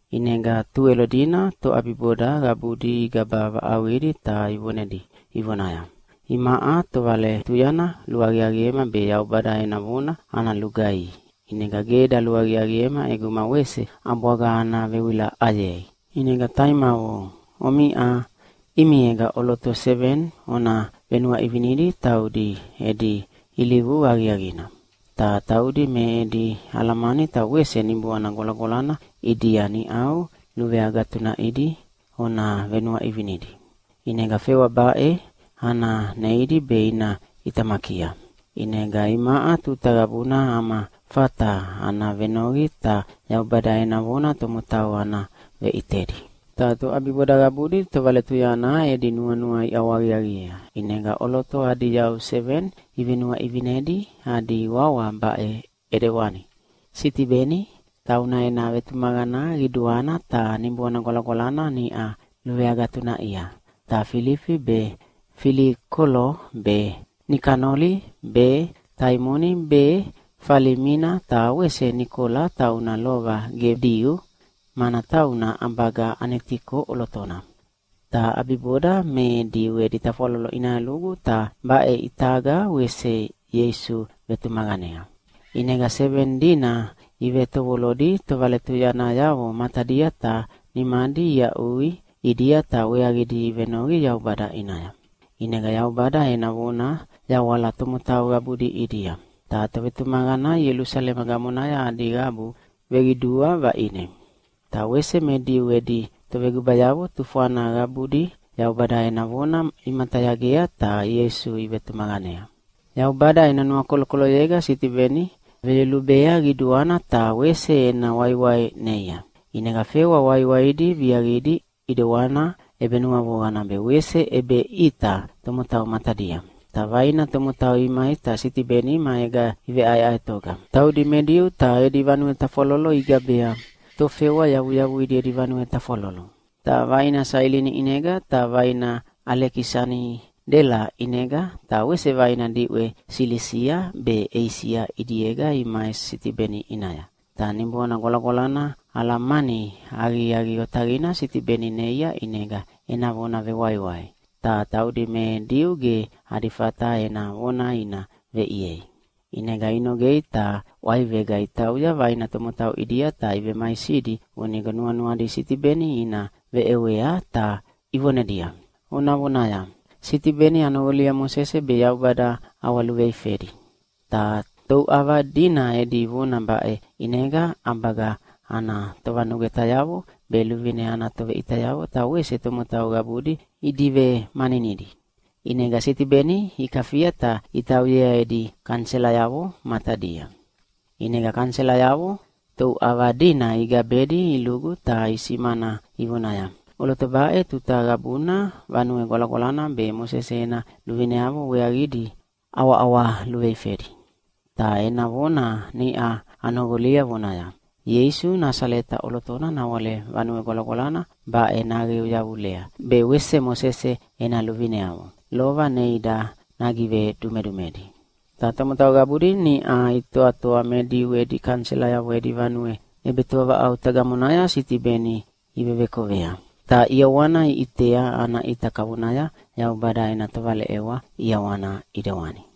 ʼInega Tuwelo dina toʼabiboda qabudi igaba vaʼauqidi ta ivonedi ivonaya, “Imaʼa tovaletuyana luaqiaqiema be Yaubada ena vona ana lugaihi, ʼinega ge daluaqiaqiema ʼeguma wese ʼabwaga ana vewilaʼayei. ʼInega taimavo, omiʼa ʼimiega ʼoloto seveni ona venuaʼivinedi taudi edi ilivu aqiaqina. Ta taudi me edi alamani ta wese Niboana Gwalagwalana ʼidia niʼau luveagatunaʼidi ona venuaʼivinedi. ʼInega fewa baʼe ana neidi be ina ʼitamakia. ʼInega imaʼa tuta qabuna ama fata ana venoqi ta Yaubada ena vona tomotau ana veʼitedi.” Ta toʼabiboda qabudi tovaletuyana edi nuanua iʼawahaqiaqiea, ʼinega ʼoloto adi yau seveni ivenuaʼivinedi, adi wawa baʼe ʼidewana: Sitibeni, tauna ena vetumaqana qiduana ta Niboana Gwalagwalana niʼa luveagatunaʼia, ta Filifi be, Filikolo be, Nikanoli be, Taimoni be, Falimina ta wese Nikola tauna lova ge Diu, mana tauna ʼabaga Anitioki ʼolotona. Ta ʼabiboda me Diu edi tafwalolo ʼinaya lugu, ta baʼe ʼitaga wese Ieisu vevetumaqanea. ʼInega seveni dina ivetovolodi tovaletuyanayavo matadia ta nimadi iaʼui ʼidia ta weaqidi ivenoqi Yaubada ʼinaya. ʼInega Yaubada ena vona yawala tomotau qabudi ʼidia. Ta tovetumaqana Ielusalema gamonaya adi qabu veqidua vaʼine. Ta wese me Diu edi tovegubayavo tufwana qabudi Yaubada ena vona imatayagea ta Ieisu ivetumaqanea. Yaubada ena nuakolokoloyega Sitibeni veyolubea qiduana ta wese ena waiwai neia. ʼInega fewa waiwaidi viaqidi ʼidewana ʼebenuavoqana be wese ʼebeʼita tomotau matadia. Ta vaina tomotau imai ta Sitibeni maega iveʼaeʼaetoga. Taudi me Diu ta edi vanue tafwalolo igabea “Tofewa Yavuyavuidi Edi Vanue Tafwalolo”. Ta vaina Sailini ʼinega ta vaina Alekisanidela ʼinega, ta wese vaina diʼwe Silisia be Eisia ʼidiega imai Sitibeni ʼinaya. Ta Niboana Gwalagwalana alamani aqiaqi otaqina Sitibeni neia ʼinega ena vona vewaiwai, ta taudi me Diu ge adi fata ena vona ina veʼiei. ʼInega inogea ta ʼwaivega itauya vaina tomotau ʼidia ta ivemaisidi vonigo nuanuadi Sitibeni ina veʼewea ta ivonedia, “Ona vonaya, ‘Sitibeni anoqolia Mosese be Yaubada ʼawaluveifedi.’” Ta touʼava dina edi vona baʼe ʼinega ʼabaga ana tovanugwetayavo be luvine ana toveʼitayavo ta wese tomotau qabudi idivemaninidi. ʼInega Sitibeni ikafia ta itauyea edi kaniselayavo matadia. ʼInega kaniselayavo touʼava dina igabedi ilugu ta isimana ivonaya, “ʼOloto baʼe tuta qabuna Vanue Gwalagwalana be Mosese ena luvineavo weaqidi ʼawaʼawa luveifedi. Ta ena vona niʼa anoqolia vonaya, ‘Ieisu Nasaleta ʼolotona nawale Vanue Gwalagwalana baʼe naqeu yavulea, be wese Mosese ena luvineavo lova neida nagivedumedumedi.’” Ta tomotau qabudi niʼa itoatoa me Diu edi kaniselayavo edi vanue ʼebetoavaʼauta gamonaya Sitibeni ivevekovea. Ta ʼiawana iʼitea ana ʼita kavonaya Yaubada ena tovaleʼewa ʼiawana ʼidewani.